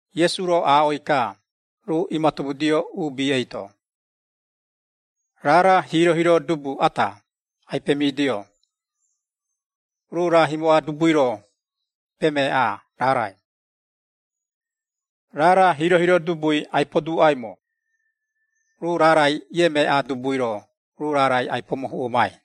Iesu-ro aaꞌoi-ka, ruu iimatomudio uubi eito, “Raara hiiro-hiiro dubu ata, ai-pemidio, ruu raa himoꞌa dubui-ro pemeaꞌaa raarai. Raara hiiro-hiiro dubui ai-poduuꞌaimo, ruu raarai iemeaꞌaa dubui-ro ruu raarai ai-pomohuꞌomai.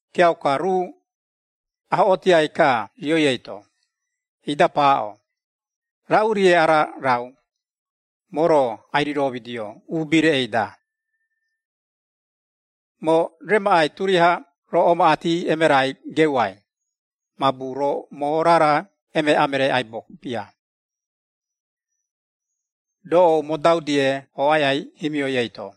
Kiauka, ruu ahoꞌootiai-ka rioi eito, ida paaꞌo, ‘Raꞌu-rie ara raau, moo-ro ai-riromidio, uubi reꞌei-da? Moo remaꞌai turiaha roo omaꞌati emerai geuai, mabu roo moo raara emeaꞌa meree aibo bia, doꞌou modau-die, ooꞌai aꞌai himioi eito.’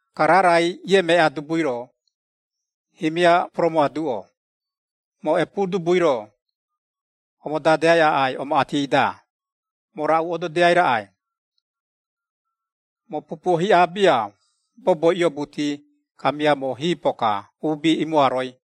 Ka raarai iemeaꞌaa dubui-ro, himia poromoaduꞌo, ‘Moo epuu dubui-ro, omodadeai aꞌai omaꞌati-da, moo raꞌu ododiai raꞌai? Moo pupuo hiꞌa bia, boboi iobuti, kamia moo hiipo-ka, uubi imoaroi.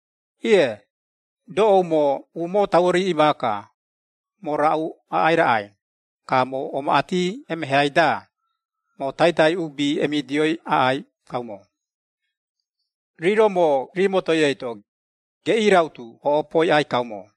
Iee, doꞌou moo umoo tauo riiꞌi maaka, moo raꞌu aꞌai raꞌai, ka moo omaꞌati emeheai-da, moo taitai uubi emidioi aꞌai kaumo, rii-ro moo rii motoi eito, geꞌii rautu oꞌopoi aꞌai kaumo.’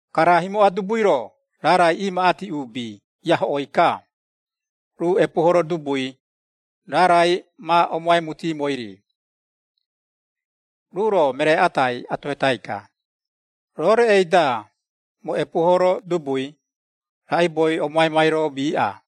“Ka raa himoꞌa dubui-ro, raarai iimaꞌati uubi iahoꞌoi-ka, ruu epuuhoro dubui, raarai ma omoaimutiimoi-ri. Ruu-ro meree atai atohetai-ka, ‘Roo reꞌei-da, moo epuuhoro dubui, raꞌaibou omoaimai-ro miiꞌa?’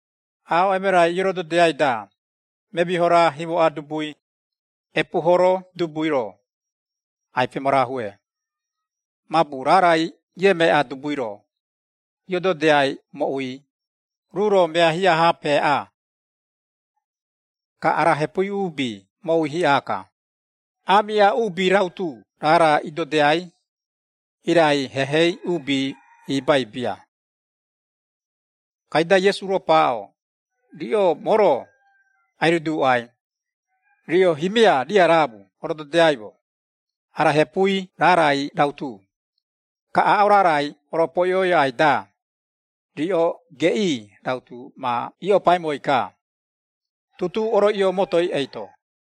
“Aaꞌo emerai iorododiaiai-da, memiho raara himoꞌa dubui, epuuhoro dubui-ro, ai-pemarahue, mabu raarai iemeaꞌaa dubui-ro, iododiai moꞌui, ruu-ro mea hiꞌa-ha, peaꞌaa. Ka ara hepui uubi moꞌui hiꞌa-ka, aamiꞌa uubi rautu raara idodiai, irai hehei uubi ibai bia.” Kaida Iesu-ro paaꞌo, “Riꞌo moo-ro, ai-riduuꞌai, riꞌo himia riaraamu orododiaimo, ara hepui raarai rautu, ka aaꞌo raarai oropoiꞌoi aꞌai-da, riꞌo geꞌii rautu ma iiꞌopaimoi-ka, tutuu oroiꞌio motoi eito.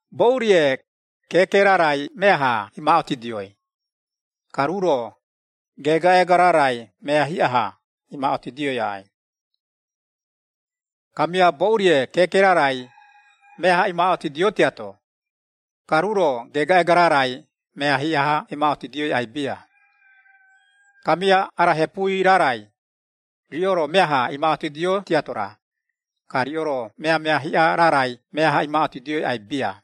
Boꞌu-rie, keeke raarai meaha imaaꞌotidioi, ka ruu-ro, geegaꞌeega raarai mea hiꞌa-ha, imaaꞌotidioi aꞌai. Kamia boꞌu-rie keeke raarai meaha imaaꞌotidio tiato, ka ruu-ro geegaꞌeega raarai mea hiꞌa-ha imaaꞌotidioi aꞌai bia. Kamia ara hepui raarai, riꞌo-ro meaha imaaꞌotidio tiato-ra, ka riꞌo-ro meamea hiꞌa raarai meaha imaaꞌotidioi aꞌai bia.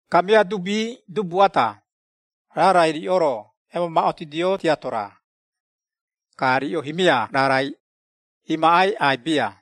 Kamia dubii dubu ata, raarai riꞌo-ro emamaaꞌotidio tiato-ra, ka riꞌo himia raarai, imaꞌai aꞌai bia.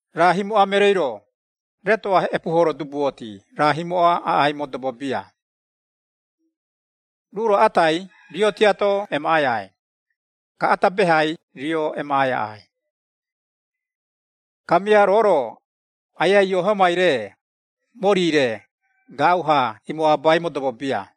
“Raa himoꞌa mereei-ro, retoꞌa epuuhoro dubuoti, raa himoꞌa aꞌai modobo bia. Ruu-ro atai rio tiato emaꞌai aꞌai, ka ata behai rio emaꞌai aꞌai. Kamia roo-ro, Aiai Iehomai-re, mori-re, gaaꞌu-ha imoabai modobo bia.”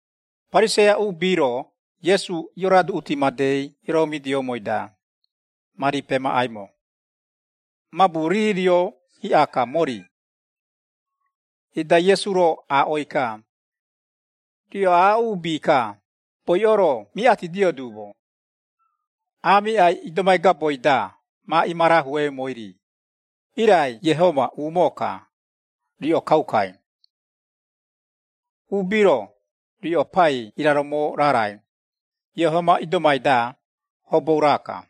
Pariseia uubi-ro, Iesu ioroaduꞌuti madei ioromidioumoi-da, mari pemaꞌaimo, mabu rii rio hiꞌa-ka mori, ida Iesu-ro aaꞌoi-ka, “Riꞌo aaꞌo uubi-ka, boiꞌo-ro miꞌatidio duumo, aamiꞌai idomai gaboi-da ma imarahueumoi-ri, irai Iehoma umoo-ka, riꞌo kaukai. Uubi-ro, riꞌo pai iraromo raarai, Iehoma idomai-da, hobou raa-ka.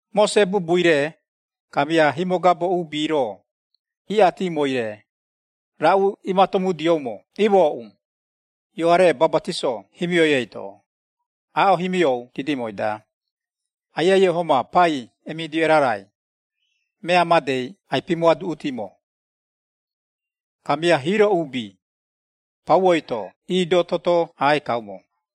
“Mose bubui-re, kamia himogabo uubi-ro iꞌatimoi-re, raꞌu iimatomudioumo imooꞌu, Ioare Bapatiso himioi eito, aaꞌo himiou didimoi-da, Aiai Iehoma pai emidio erarai, mea madei ai-pimoaduꞌutimo. Kamia hiiro uubi, pauoi-to iidoo toto aꞌai kaumo.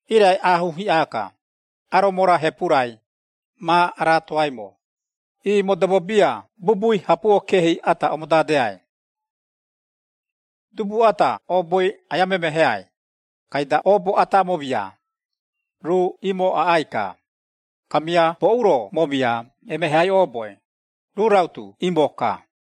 Irai aahuu hiꞌa-ka, aromo-ra, hepu-rai, ma araatoaimo, ii modobo bia bubui hapuo keehi ata, omodadeai. “Dubu ata ooboi aia memeheai, kaida oobo ata amomia, ruu imo aꞌai-ka, kamia boꞌu-ro momia emeheai ooboi, ruu rautu imo-ka.”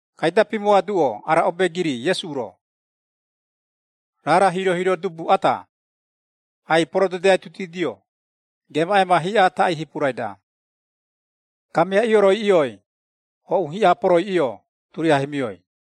Kaida pimoaduꞌo ara obeegiri Iesu-ro. “Raara hiiro-hiiro dubu ata, ai-porododiaitutidio, geemaꞌeema hiꞌa taꞌii hipurai-da, kamia ioroiꞌioi, hoꞌu hiꞌa poroiꞌio, turiaha himioi.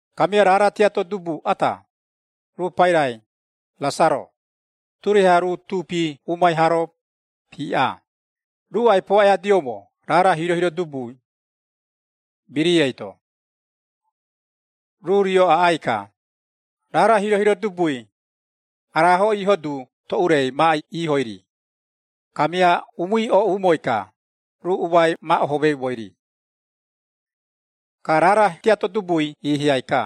Kamia raara tiato dubu ata, ruu pairai, Rasaro, turiaha ruu tuupi umai haa-ro piiꞌa, ruu ai-poaꞌoiadioumo raara hiiro-hiiro dubui, birii eito. Ruu rio aꞌai-ka, raara hiiro-hiiro dubui, araaho iiho du toꞌurei, ma iihoi-ri, kamia umui ooꞌumoi-ka, ruu umai ma ohomeumoi-ri. “Ka raara tiato dubui iihiai-ka,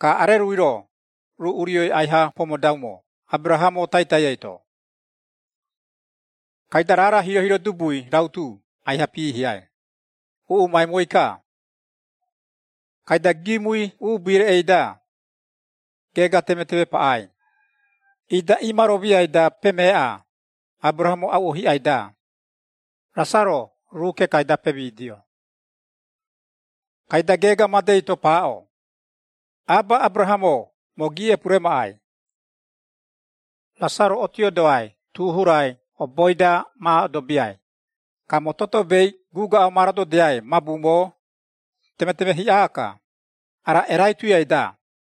ka arerui-ro, ruu urioi aiha pomodaumo Aberahamo taitai eito. Kaida raara hiiro-hiiro dubui rautu aiha piihiai, uuꞌumaimoi-ka. Kaida, giimui uubi reꞌei-da, geega temeteme paꞌai, ida iimaromiai-da, pemeeꞌa Aberahamo auꞌo hiꞌai-da, Rasaro ruu kekai-da pemidio. Kaida geega madei-to paaꞌo, ‘Aba Aberahamo, moo giiꞌepu remaꞌai! Rasaro otiodoai tu hurai oboi-da ma odobiai, ka moo totobei guuaꞌo ma rododiai, mabu moo temeteme hiꞌa-ka, ara erai tuiai-da.’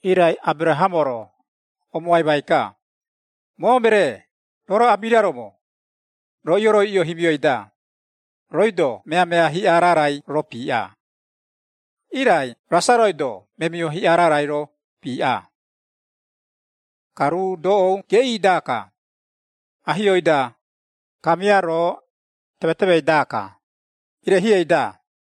“Irai Aberahamo-ro, omoaimai-ka, ‘Moo meree, roo-ro amiraromo, roo ioroiꞌio himioi-da, rooi-do meamea hiꞌa raarai-ro piiꞌa, irai Rasaroi-do memiho hiꞌa raarai-ro, piiꞌa. Ka ruu doꞌou geꞌii-daka, ahiou-da, kamia roo, temetemei-daka, irehieꞌei-da.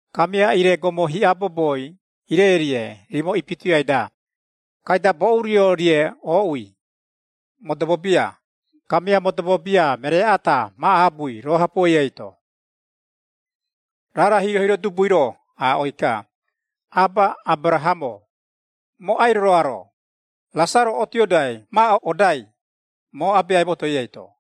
Kamia ire gomo hiꞌa boboi ireirie rimo ipituiai-da, kaida boꞌu rio-rie ooꞌui, modobo bia, kamia modobo bia meree ata ma aabui roo hapuoi eito.’ Raara hiiro-hiiro dubui-ro aaꞌoi-ka, ‘Aba Aberahamo, moo ai-roroaro, Rasaro otiodoai ma odai, moo abeai motoi eito.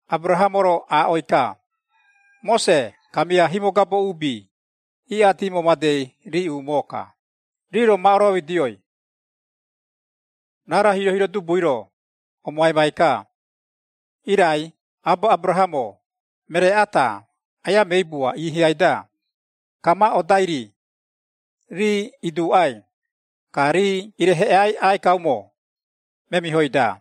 “Aberahamo-ro aaꞌoi-ka, ‘Mose, kamia himogabo uubi, iꞌatimo madei rii umoo-ka, rii-ro ma oromidioi.’ Raara hiiro-hiiro dubui-ro, omoaimai-ka, ‘Irai, Aba Aberahamo, meree ata aia meibua, iihiai-da, ka ma odai-ri, rii iduuꞌai, ka rii ireheꞌeai aꞌai kaumo, memihoi-da.’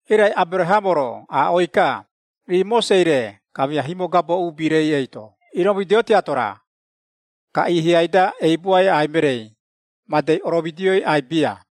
Irai Aberahamo-ro aaꞌoi-ka, ‘Rii Mosei-re, kamia himogabo uubi-rei eito iroomidio tiato-ra, ka iihiai-da eibuai aꞌai mereei, madei oromidioi aꞌai bia.’”